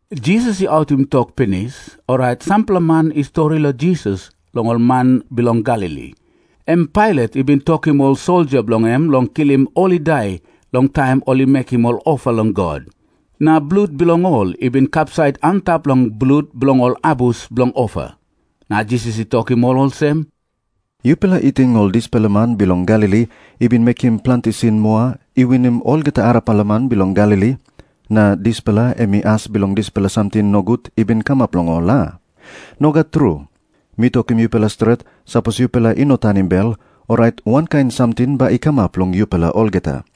Jisas i autim tok pinis, orait sampela man i stori long Jisas long ol man bilong Galili, em Pailat i bin tokim ol soldia bilong en long kilim ol i dai long taim ol i mekim ol ofa long God, na blut bilong ol i bin kapsait antap long blut bilong ol abus bilong ofa. Na Jisas i tokim ol olsem, “Yupela i ting ol dispela man bilong Galili i bin mekim planti sin moa i winim olgeta arapela man bilong Galili, na dispela em i as bilong dispela samting nogut i bin kamap long ol, a? Nogat tru. Mi tokim yupela stret, sapos yupela i no tanim bel, orait wankain samting bai i kamap long yupela olgeta.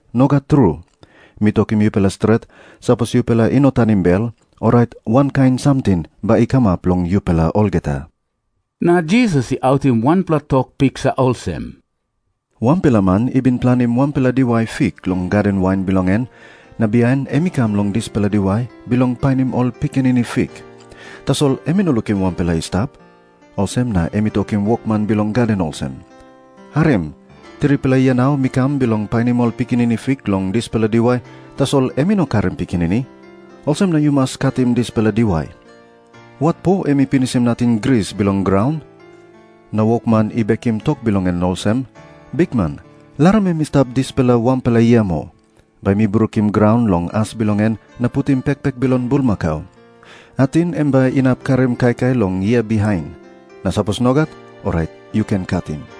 Nogat tru. Mi tokim yupela stret, sapos yupela i no tanim bel, orait wankain samting bai i kamap long yupela olgeta.” Na Jisas i autim wanpela tok piksa olsem, “Wanpela man i bin planim wanpela diwai fik long gaden wain bilong en, na bihain em i kam long dispela diwai bilong painim ol pikinini fik. Tasol em i no lukim wanpela i stap. Olsem na em i tokim wokman bilong gaden olsem, ‘Harim. Tripela yia nau mi kam bilong painim ol pikinini fik long dispela diwai, tasol em i no karim pikinini. Olsem na yu mas katim dispela diwai. Watpo em i pinisim nating gris bilong graun?’ Na wokman i bekim tok bilong em olsem, ‘Bikman, larim em i stap dispela wanpela yia moa. Bai mi brukim graun long as bilong en na putim pekpek bilong bulmakau. Ating em bai inap karim kaikai long yia bihain. Na sapos nogat, orait yu ken katim.’”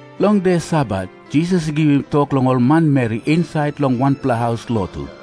Long de Sabat Jisas i givim tok long ol manmeri insait long wanpela haus lotu.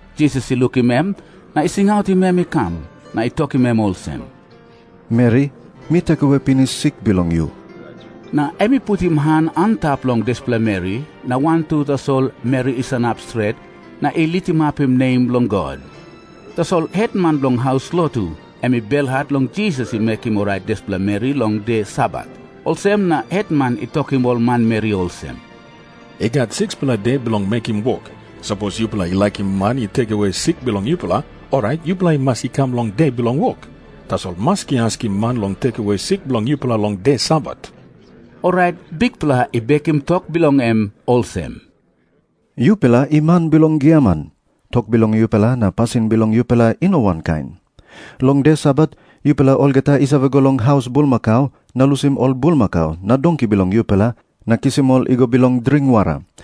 Jisas i lukim em, na i singautim em i kam, na i tokim em olsem, “Meri, mi oraitim pinis sik bilong yu.” Na em i putim han antap long dispela meri, na wantu tasol meri i sanap stret na i litimapim nem bilong God. Tasol hetman bilong haus lotu em i belhat long Jisas i mekim orait dispela meri long de Sabat. Olsem na hetman i tokim ol manmeri olsem, “I gat 6-pela de bilong mekim wok. Sapos yupela i laikim man i oraitim sik bilong yupela, orait yupela i mas i kam long de bilong wok. Tasol maski askim man long oraitim sik bilong yupela long de Sabat.” Orait Bikpela i bekim tok bilong em olsem, “Yupela i man bilong giaman. Tok bilong yupela na pasin bilong yupela i no wankain. Long de Sabat yupela olgeta i save go long haus bulmakau na lusim ol bulmakau na donki bilong yupela, na kisim ol i go bilong dring wara.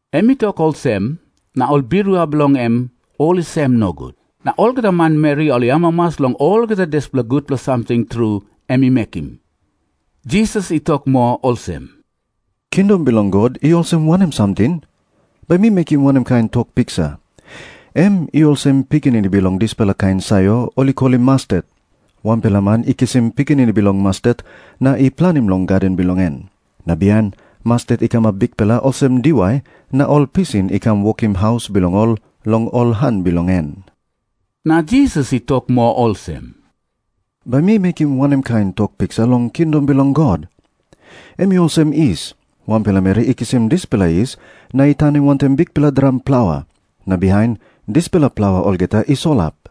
Em i tok olsem, na ol birua bilong en ol i sem nogut. Na olgeta manmeri ol i amamas long olgeta dispela gutpela samting tru em i mekim. Jisas i tok moa olsem, “Kingdom bilong God i olsem wanem samting? Bai mi mekim wanem kain tok piksa? Em i olsem pikinini bilong dispela kain sayor ol i kolim mastet. Wanpela man i kisim pikinini bilong mastet na i planim long gaden bilong en. Na bihain mastet i kamap bikpela olsem diwai na ol pisin i kam wokim haus bilong ol long ol han bilong en.” Na Jisas i tok moa olsem, “Bai mi mekim wanem kain tok piksa long kingdom bilong God? Em i olsem yis. Wanpela meri i kisim dispela yis na i tanim wantaim bikpela dram plaua. Na bihain dispela plaua olgeta i solap.”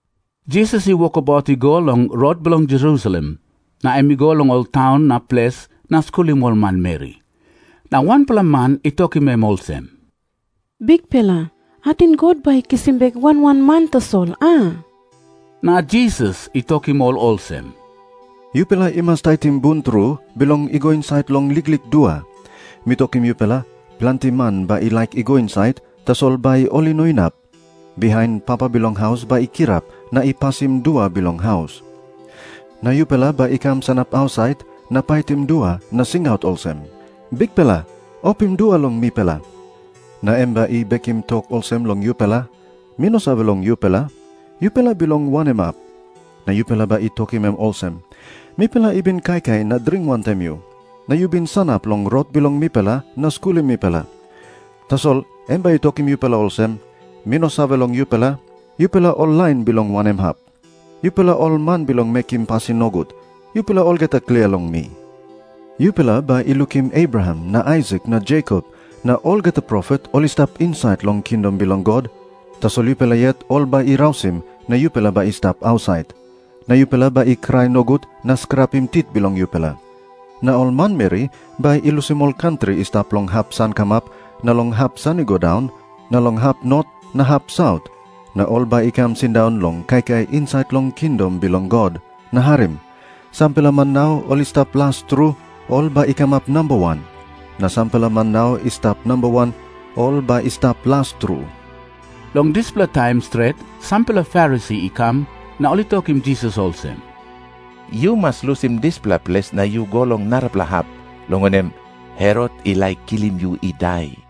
Jisas i wokabaut i go long rot bilong Jerusalem. Na em i go long ol taun na ples na skulim ol manmeri. Na wanpela man i tokim em olsem, “Bikpela, ating God bai i kisim bek wan wan man tasol, a?” Na Jisas i tokim ol olsem, “Yupela i mas taitim bun tru, bilong i go insait long liklik dua. Mi tokim yupela, planti man bai i laik i go insait, tasol bai ol i no inap. Bihain papa bilong haus bai i kirap na i pasim dua bilong haus. Na yupela bai i kam sanap ausait na paitim dua na singaut olsem, ‘Bikpela, opim dua long mipela.’ Na em bai i bekim tok olsem long yupela, ‘Mi no save long yupela, yupela i bilong wanem hap.’ Na yupela bai i tokim em olsem, ‘Mipela i bin kaikai na dring wantaim yu, na yu bin sanap long rot bilong mipela na skulim mipela.’ Tasol em bai i tokim yupela olsem, ‘Mi no save long yupela, yupela ol lain bilong wanem hap. Yupela ol man bilong mekim pasin nogut, yupela olgeta klia long mi.’ Yupela bai i lukim Abraham na Aisak na Jekop na olgeta profet ol i stap insait long kingdom bilong God, tasol yupela yet ol bai i rausim na yupela bai i stap ausait. Na yupela bai i krai nogut na skrapim tit bilong yupela. Na ol manmeri bai i lusim ol kantri i stap long hap sankamap na long hap san i go daun na long hap not na hap saut, na ol bai i kam sindaun long kaikai insait long kingdom bilong God. Na harim. Sampela man nau ol i stap las tru, ol bai i kamap namba wan. Na sampela man nau i stap namba wan, ol bai i stap las tru.” Long dispela taim stret sampela Farisi i kam, na ol i tokim Jisas olsem, “Yu mas lusim dispela ples na yu go long narapela hap, long wanem, Herot i laik kilim yu i dai.”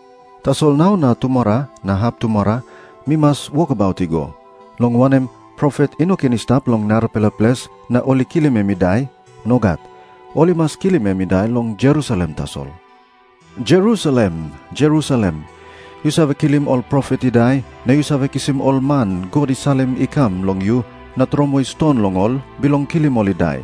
Tasol nau na tumora na haptumora mi mas wokabaut i go. Long wanem, profet i no ken i stap long narapela ples na ol i kilim em i dai. Nogat. Ol i mas kilim em i dai long Jerusalem tasol. “Jerusalem, Jerusalem, yu save kilim ol profet i dai, na yu save kisim ol man God i salim i kam long yu na tromoi ston long ol bilong kilim ol i dai.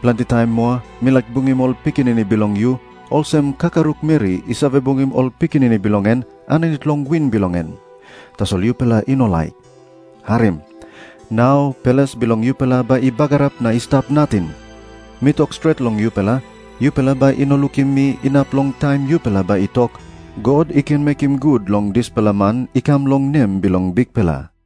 Planti taim moa mi laik bungim ol pikinini bilong yu, olsem kakaruk meri i save bungim ol pikinini bilong en aninit long wing bilong en. Tasol yupela i no laik. Harim. Nau ples bilong yupela bai i bagarap na i stap nating. Mi tok stret long yupela, yupela bai i no lukim mi inap long taim yupela bai i tok, ‘God i ken mekim gut long dispela man i kam long nem bilong Bikpela!’”